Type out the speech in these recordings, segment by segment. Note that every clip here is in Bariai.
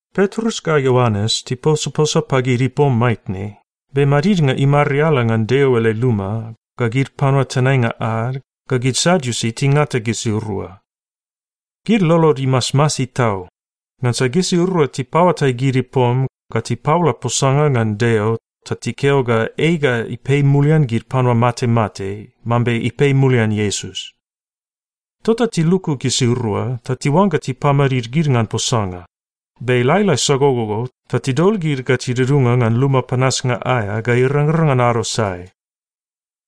Petrus ga Ioanes tiposaposa pagid ipom maitne, be madidnga imariala ngan Deo ele luma, ga gid panua tenainga ad, ga gid Sadiusi tingata gisirua. Gid lolod imasmasi tau, ngansa gisirua tipaoatai gid ipom ga tipaola posanga ngan Deo ta tikeo ga ei ga ipei mulian gid panua matemate mambe ipei mulian Iesus. Tota tiluku gisirua ta tiuangga tipamadid gid ngan posanga, be lailai sagogogo, ta tidol gid ga tidudunga ngan luma panasnga aea ga irangrang ngan ado sae.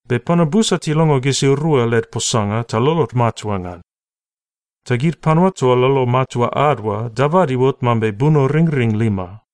Be panua busa tilongo gisirua led posanga ta lolod matua ngan. Ta gid panua toa lolo matua ad oa dabad iuot mambe bunoringring lima.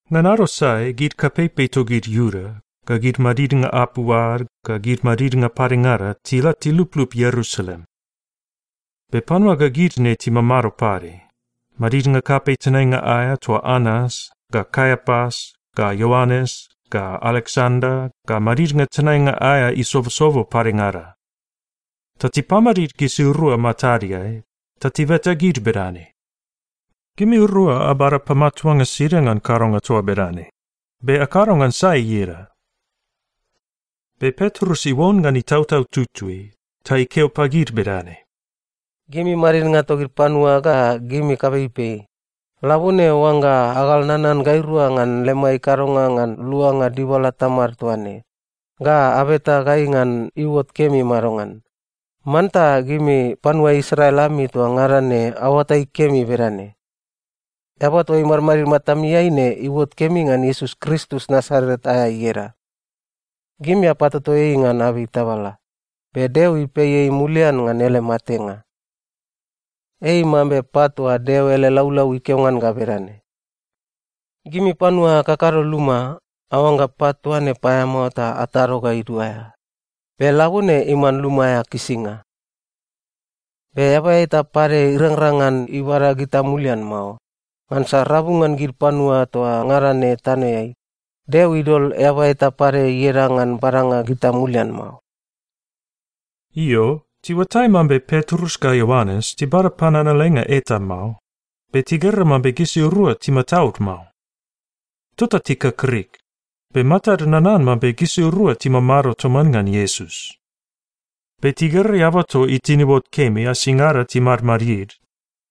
Ngan ado sae gid kapeipei togid Iuda, ga gid madidnga apu ad, ga gid madidnga padengada tila tiluplup Ierusalem. Be panua ga gid ne timamado pade, madidnga kapei tenainga aea toa Anas, ga Kaiapas, ga Ioanes, ga Aleksanda, ga madidnga tenainga aea isobosobo padengada. Ta tipamadid gisirua matadeai, ta tibeta gid bedane, “Gimirua abada pamatuanga sida ngan kadonga toa bedane? Be akado ngan sai ieda?” Be Petrus iuon ngan Itautau Tutui, ta ikeo pagid bedane, “Gimi madidnga togid panua ga gimi kapeipei, labone, oangga agal nanan gairua ngan lemai kadonga ngan luanga dibala tamad toa ne, ga abeta gai ngan iuot kemi madongan, manta gimi panua Israel ami toa ngada ne aoatai kemi bedane: Eaba toa imadmadid matamiai ne iuot kemi ngan Iesus Kristus Nasaret aea ieda. Gimi apatoto ei ngan abei tabala, be Deo ipei ei mulian ngan ele matenga. Ei mambe pat toa Deo ele laulau ikeo ngan ga bedane, “‘Gimi panua akakado luma, aoangga pat toa ne paeamao ta atado ga iduaea. Be labone iman luma aea kisinga.’ Be eaba eta pade irangrang ngan ibada gita mulian mao, ngansa rabu ngan gid panua toa ngada ne tanoeai, Deo idol eaba eta pade ieda ngan badanga gita mulian mao.” Io, tiuatai mambe Petrus ga Ioanes tibada pananalenga eta mao, be tigera mambe gisirua timataud mao. Tota tikakrik, be matad nanan mambe gisirua timamado toman ngan Iesus. Be tigera eaba toa itin iuot kemi asingada timadmadid,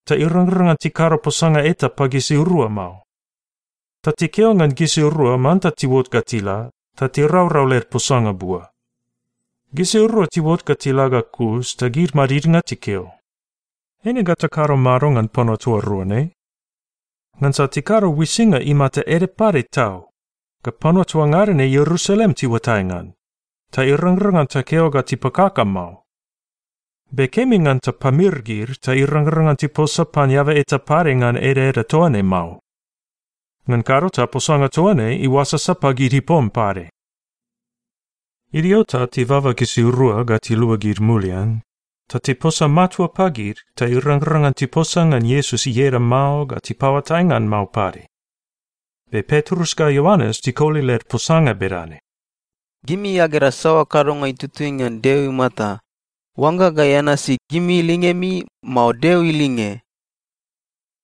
ta irangrang ngan tikado posanga eta pagisirua mao. Ta tikeo ngan gisirua manta tiuot ga tila, ta tiraurau led posanga bua. Gisirua tiuot ga tila ga kus ta gid madidnga tikeo, “Eine ga takado mado ngan panua toa rua ne? Ngansa tikado uisinga imata ede pade tau, ga panua toa ngada ne Ierusalem tiuatai ngan, ta irangrang ngan takeo ga tipakaka mao. Be kemi ngan tapamir gid ta irangrang ngan tiposa pan eaba eta pade ngan edaeda toa ne mao. Ngan kado ta posanga toa ne iuasasa pagid ipom pade.” Idio ta tibaba gisirua ga tiluagid mulian, ta tiposa matua pagid ta irangrang ngan tiposa ngan Iesus ieda mao ga tipaoatai ngan mao pade. Be Petrus ga Ioanes tikoli led posanga bedane, “Gimi agera saoa kadonga itutui ngan Deo imata, oangga gai anasi gimi lingemi, mao Deo ilinge?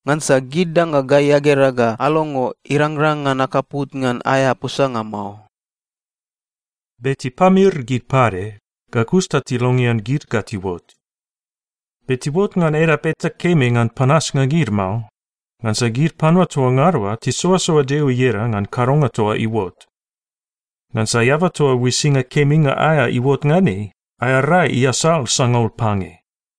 Ngansa gid danga gai agera ga alongo, irangrang ngan akaput ngan aea posanga mao.” Be tipamir gid pade, ga kus ta tilongean gid ga tiuot. Be tiuot ngan edap eta kemi ngan panasnga gid mao, ngansa gid panua toa ngada oa tisoasoa Deo ieda ngan kadonga toa iuot. Ngansa eaba toa uisinga keminga aea iuot ngan ei, aea rai iasal sangaul pange.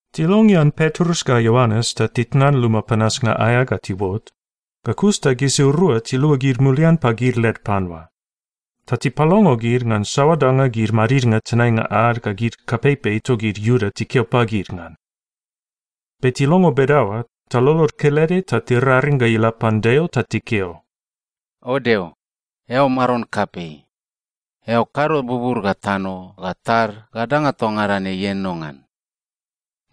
Tilongean Petrus ga Ioanes ta titnan luma panasnga aea ga tiuot, ga kus ta gisirua tiluagid mulian pagid led panua. Ta tipalongo gid ngan saoa danga gid madidnga tenainga ad ga gid kapeipei togid Iuda tikeo pagid ngan. Be tilongo bedaoa, ta lolod kelede ta tiraring ga ila pan Deo ta tikeo, “O Deo, eao Maron kapei. Eao kado bubur ga tano ga tad ga danga toa ngada ne ienono ngan.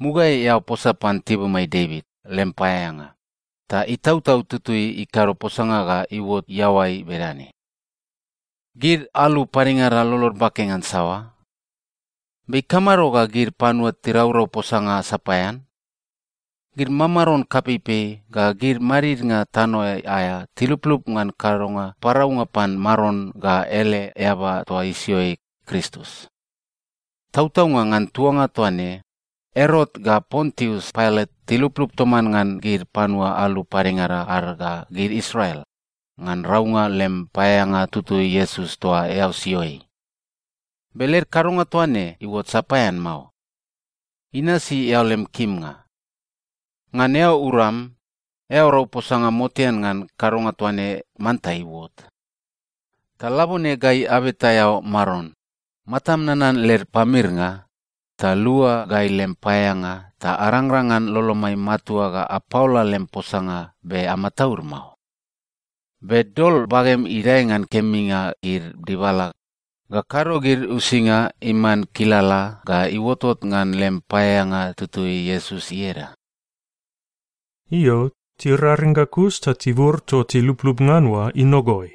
Mugaeai, eao posa pan tibumai Devit lem paeaeanga, ta Itautau Tutui ikado posanga ga iuot iaoai bedane, “‘Gid alu padengada lolod bake ngan saoa? Be ikamado ga gid panua tiraurau posanga sapaean? Gid mamaron kapeipei ga gid madidnga tanoeai aea tiluplup ngan kadonga paraunga pan Maron ga ele eaba toa isio ei, Kristus.’ Tautaunga, ngan tuanga toa ne, Erot ga Pontius Pailat tiluplup toman ngan gid panua alu padengada ad ga gid Israel, ngan raunga lem paeaeanga tutui Iesus toa eao sio ei. Be led kadonga toa ne iuot sapaean mao. Inasi eao lem kimnga. Ngan eao uram, eao rau posanga motean ngan kadonga toa ne manta iuot. Ta labone gai abeta eao, Maron, matam nanan led pamirnga, ta lua gai lem paeaeanga ta arangrang ngan lolomai matua ga apaola lem posanga be amataud mao. Be dol bagem idae ngan keminga gid dibala, ga kado gid uisinga iman kilala ga iuotot ngan lem paeaeanga tutui Iesus ieda.” Io, tiraring ga kus ta tibur toa tiluplup ngan oa inogoi.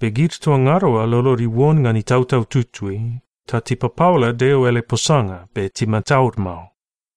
Be gid toa ngada oa lolod iuon ngan Itautau Tutui, ta tipapaola Deo ele posanga be timataud mao.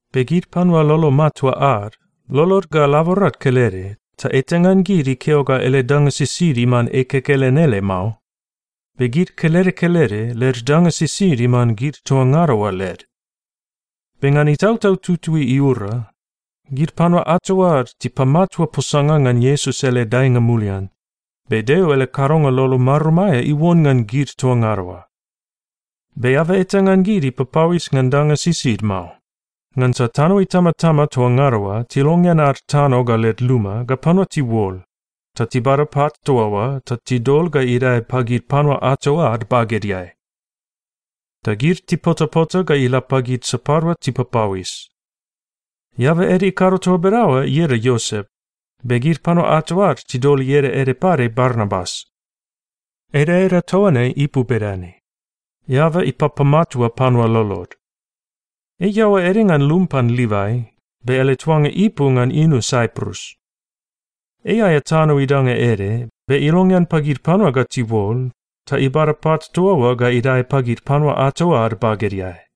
Be gid panua lolo matua ad, lolod ga laborad kelede, ta eta ngan gid ikeo ga ele danga sisid iman ei kekelen ele mao. Be gid kelede kelede led danga sisid iman gid toa ngada oa led. Be ngan Itautau Tutui iura, gid panua ato ad tipamatua posanga ngan Iesus ele daenga mulian, be Deo ele kadonga lolo marum aea iuon ngan gid toa ngada oa. Be eaba eta ngan gid ipapauis ngan danga sisid mao, ngansa tano itamatama toa ngada oa tilongean ad tano ga led luma ga panua tiuol, ta tibada pat toa oa ta tidol ga idae pagid panua ato ad bagedeai. Ta gid tipotapota ga ila pagid sapadua tipapauis. Eaba ede ikado toa bedaoa ieda Iosep, be gid panua ato ad tidol ieda ede pade Barnabas. (Edaeda toa ne ipu bedane, “Eaba Ipapamatua Panua Lolod.”) Ei iaoa ede ngan lum pan Livai, be ele tuanga ipu ngan inu Saiprus. Ei aea tano idanga ede, be ilongean pagid panua ga tiuol, ta ibada pat toa oa ga idae pagid panua ato ad bagedeai.